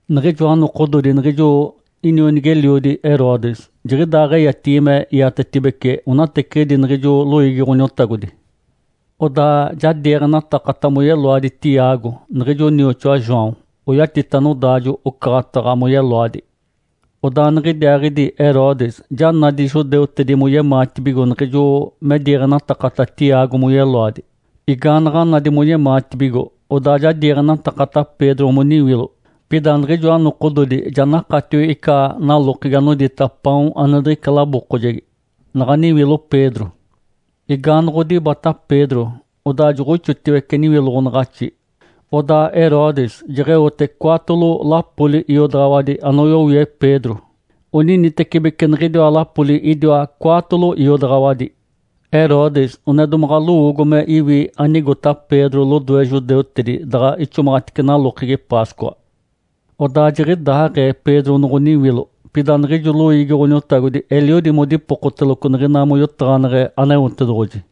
Niɡ̶ijoa nokododi niɡ̶ijo inionigi-eliodi Herodes jiɡ̶idaaɡ̶eyatigi me iatetibeci onateciɡ̶idi niɡ̶ijo loiigi Ǥoniotagodi. Odaa ja diiɡ̶enatakata moyeloadi Tiago niɡ̶ijo nioxoa João, oyatita nodaajo-ocaɡ̶ataɡ̶a moyeloadi. Odaa niɡ̶idiaaɡ̶idi Herodes ja nadi judeutedi moyemaatibigo niɡ̶ijo me diiɡ̶enatakata Tiago moyeloadi. Igaanaɡ̶a nadi moyemaatibigo, odaa ja diiɡ̶enatakata Pedro moniwilo. Pida niɡ̶ijoa nokododi ja nakatio ica nalokegi anodita “Paon ane diɡ̶ica labookojegi” naɡ̶a niwilo Pedro. Igaanoɡ̶odibata Pedro, odaa joɡ̶oixotiwece niwiloɡ̶onaɡ̶axi, odaa Herodes jeɡ̶eote cwaatolo lapoli iodaɡ̶awadi anoyowie Pedro. Oninitecibeci niɡ̶idiwa lapoli idiwa cwaatolo iodaɡ̶awadi. Herodes one domaɡ̶a lowoogo me iwi anigota Pedro lodoe judeutedi, daɡ̶a ixomaɡ̶atice nalokegi Páscoa. Odaa jiɡ̶idaaɡ̶ee Pedro noɡ̶oniwilo, pida niɡ̶ijo loiigi Ǥoniotagodi eliodi modipokoteloco niɡ̶ina moyotaɡ̶aneɡ̶e Aneotedoɡ̶oji.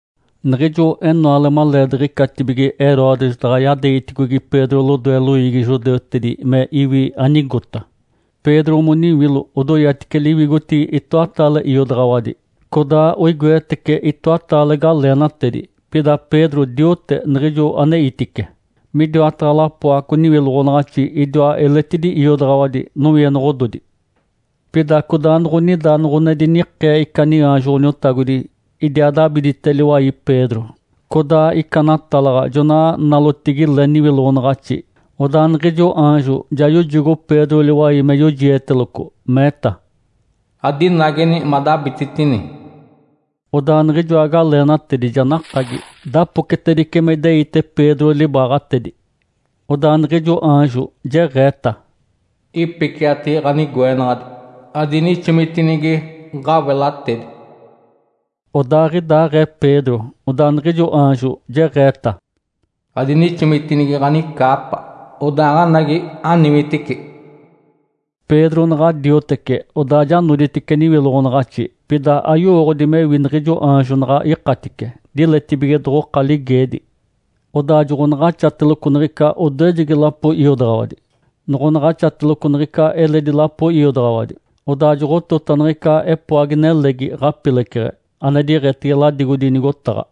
Niɡ̶ijo enoale maleediɡ̶icatibige Herodes daɡ̶a yadeegiticogi Pedro lodoe loiigi judeutedi me iwi anigota, Pedro moniwilo odoyatice liwigotigi itoataale iodaɡ̶awadi, codaa oigoetece itoataale galeenatedi. Pida Pedro diote niɡ̶ijo aneitice. Midiwataɡ̶a lapoaco niwiloɡ̶onaɡ̶axi idiwa eletidi iodaɡ̶awadi nowienoɡ̶ododi. Pida codaanoɡ̶onida noɡ̶one dinikee ica niaanjo Ǥoniotagodi idiaa dabidite liwai Pedro. Codaa ica natalaɡ̶a jona nalotigi le niwiloɡ̶onaɡ̶axi. Odaa niɡ̶ijo aanjo ja yojogo Pedro liwai me yojieteloco, meeta, “Adinageni madabititini!” Odaa niɡ̶ijoa galeenatedi ja nakagi, dapocetedice me ideite Pedro libaaɡ̶atedi. Odaa niɡ̶ijo aanjo jeɡ̶eeta, “Ipiciati ɡ̶anigoenaɡ̶adi, adinixomitinigi ɡ̶awelatedi!” Odaaɡ̶idaaɡ̶ee Pedro, odaa niɡ̶ijo aanjo jeɡ̶eeta, “Adinixomitinigi ɡ̶anicaapa, odaaɡ̶anagi, aniwitici!” Pedro naɡ̶a diotece, odaa ja noditice niwiloɡ̶onaɡ̶axi. Pida ayowooɡ̶odi mewi niɡ̶ijo aanjo naɡ̶a ikatice, diletibige doɡ̶oka ligeedi. Odaa joɡ̶onaɡ̶axateloco niɡ̶ica odoejegi lapo iodaɡ̶awadi, noɡ̶onaɡ̶axateloco niɡ̶ica eledi lapo iodaɡ̶awadi, odaa joɡ̶otota niɡ̶ica epoagi-nelegi ɡ̶apileceɡ̶e, ane diiɡ̶etege ladigodi nigotaɡ̶a.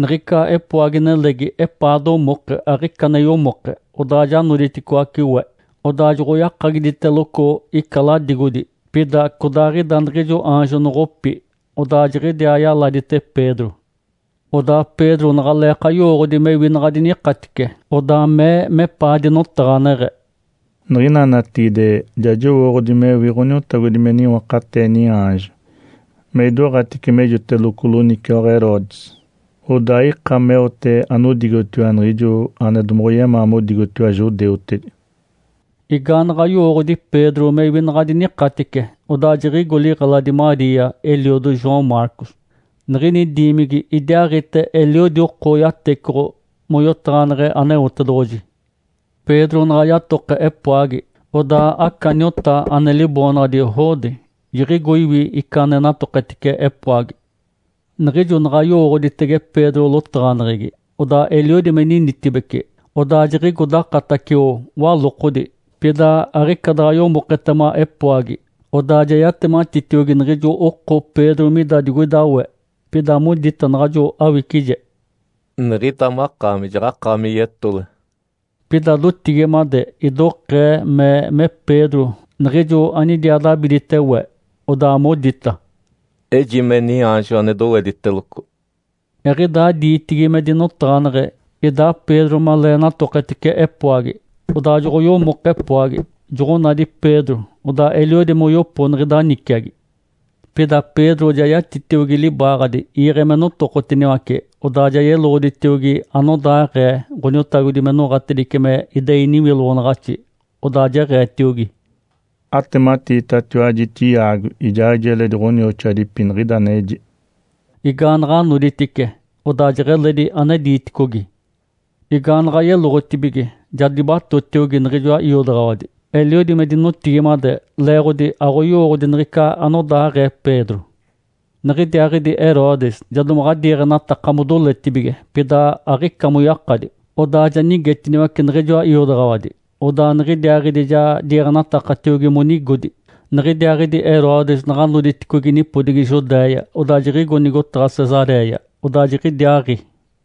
Niɡ̶ica epoagi-nelegi epaa domoke, aɡ̶ica ane yomoke, odaa ja noditicoaci we. Odaa joɡ̶oyakagiditeloco ica ladigodi, pida codaaɡ̶ida niɡ̶ijo aanjo noɡ̶opi, odaa jiɡ̶idiaa yaladite Pedro. Odaa Pedro naɡ̶aleeka yowooɡ̶odi mewi naɡ̶a dinikatice, odaa mee mepaa dinotaɡ̶aneɡ̶e, “Niɡ̶ina natigide ja jowooɡ̶odi mewi Ǥoniotagodi me niwakatee niaanjo me idoɡ̶atice mejoteloco loniciwaɡ̶a Herodes, odaa aika meote anigotiwa niɡ̶ijo ane domoɡ̶oyemaa modigotiwa judeutedi.” Igaanaɡ̶a yowooɡ̶odi Pedro mewi naɡ̶a dinikatice, odaa jiɡ̶igo liɡ̶eladi Maria, eliodo João Marcos. Niɡ̶ini diimigi idiaaɡ̶ite eliodi oko yatecoɡ̶o moyotaɡ̶aneɡ̶e Aneotedoɡ̶oji. Pedro naɡ̶a yatoke epoagi, odaa aca niota ane liboonaɡ̶adi Rode jiɡ̶igo iwi ica ane natoketice epoagi. Niɡ̶ijo naɡ̶a yowooɡ̶oditege Pedro lotaɡ̶aneɡ̶egi, odaa eliodi me ninitibece, odaa jiɡ̶igo dakatacio walokodi, pida aɡ̶ica daɡ̶a yomoketema epoagi. Odaa ja yatematitiogi niɡ̶ijo oko Pedro mida digoida we. Pida modita naɡ̶ajo awicije, “Niɡ̶ida makaami jaɡ̶akaami yetole!” Pida dotigimade idokee mee me Pedro niɡ̶ijo anidiaa dabidite we. Odaa modita, “Ejime niaanjo ane dowediteloco.” Eɡ̶idaa diitigi me dinotaɡ̶aneɡ̶e, idaa Pedro malee natoketice epoagi. Odaa noɡ̶oyomoke epoagi, joɡ̶onadi Pedro, odaa eliodi moyopo niɡ̶ida niciagi. Pida Pedro ja yatitiogi libaaɡ̶adi iiɡ̶e me notokotiniwace, odaa ja yeloɡ̶oditiogi anodaaɡ̶ee Ǥoniotagodi me noɡ̶atedice me idei niwiloɡ̶onaɡ̶axi. Odaa jeɡ̶eetiogi, “Atematiitatiwaji Tiago ijaaɡ̶ijo eledi ɡ̶onioxoadipi niɡ̶ida aneji.” Igaanaɡ̶a noditice, odaa jeɡ̶eledi ane diiticogi. Igaanaɡ̶a yeloɡ̶otibige, ja dibatotiogi niɡ̶ijoa iodaɡ̶awadi, eliodi me dinotigimade, leeɡ̶odi aɡ̶oyowooɡ̶odi niɡ̶ica anodaaɡ̶ee Pedro. Niɡ̶idiaaɡ̶idi Herodes ja domaɡ̶a diiɡ̶enataka modoletibige, pida aɡ̶ica moyakadi. Odaa ja nigetiniwace niɡ̶ijoa iodaɡ̶awadi, odaa niɡ̶idiaaɡ̶idi ja diiɡ̶enatakatiogi monigodi. Niɡ̶idiaaɡ̶idi Herodes naɡ̶a noditicogi nipodigi Judéia, odaa jiɡ̶igo nigotaɡ̶a Cesaréia. Odaa jiɡ̶idiaaɡ̶i.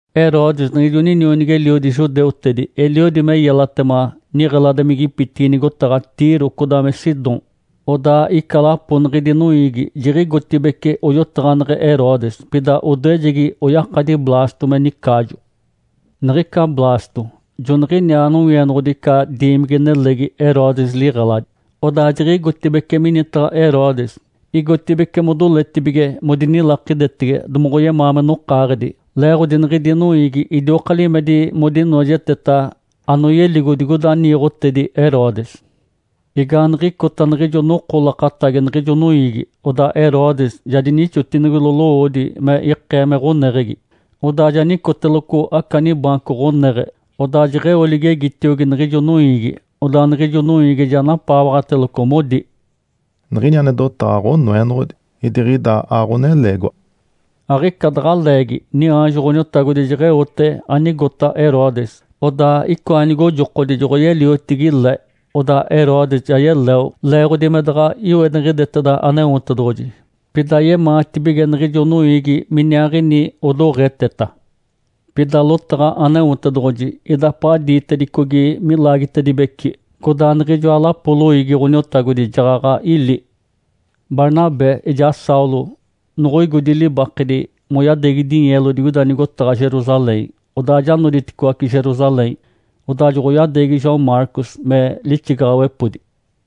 Herodes, niɡ̶ijo ninionigi-eliodi judeutedi eliodi me yelatema niɡ̶eladimigipitigi nigotaɡ̶a Tiro codaa me Sidom. Odaa ica lapo niɡ̶idi noiigi jiɡ̶igotibeci oyotaɡ̶aneɡ̶e Herodes. Pida odoejegi oyakadi Blasto me nicaajo. Niɡ̶ica Blasto joniɡ̶iniaa nowienoɡ̶odi ica diimigi-nelegi Herodes liɡ̶eladi. Odaa jiɡ̶igotibeci minitaɡ̶a Herodes, igotibeci modoletibige modinilakidetege domoɡ̶oyemaa me nokaaɡ̶edi, leeɡ̶odi niɡ̶idi noiigi idioka limedi modinoojeteta anoyeligo digoida niiɡ̶otedi Herodes. Igaaniɡ̶icota niɡ̶ijo noko lakatagi niɡ̶ijo noiigi, odaa Herodes ja dinixotinigilo lowoodi me ikee me ɡ̶oneɡ̶egi, odaa ja nicoteloco aca nibaanco ɡ̶oneɡ̶e. Odaa jeɡ̶eo ligegitiogi niɡ̶ijo noiigi. Odaa niɡ̶ijo noiigi ja napaawaɡ̶ateloco, modi, “Niɡ̶ini ane dotaɡ̶a ɡ̶onoenoɡ̶odi, idiɡ̶ida aɡ̶oneleegiwa!” Aɡ̶ica daɡ̶a leegi niaanjo Ǥoniotagodi jeɡ̶eote anigota Herodes, odaa icoa nigojokodi joɡ̶oyeliotigi le, odaa Herodes ja yeleo, leeɡ̶odi me daɡ̶a iweniɡ̶ideteda Aneotedoɡ̶oji. Pida yemaatibige niɡ̶ijo noiigi miniaaɡ̶ini odoɡ̶eteta. Pida lotaɡ̶a Aneotedoɡ̶oji idapaɡ̶a diitedicogi milaagitedibeci, codaa niɡ̶ijoa lapoli loiigi Ǥoniotagodi jaɡ̶aɡ̶a ili. Barnabé ijaa Saulo noɡ̶oigodi libakedi moyadeegi dinyeelo digoida nigotaɡ̶a Jerusalém, odaa ja noditicoaci Jerusalém, odaa joɡ̶oyadeegi João Marcos me lixigaɡ̶awepodi.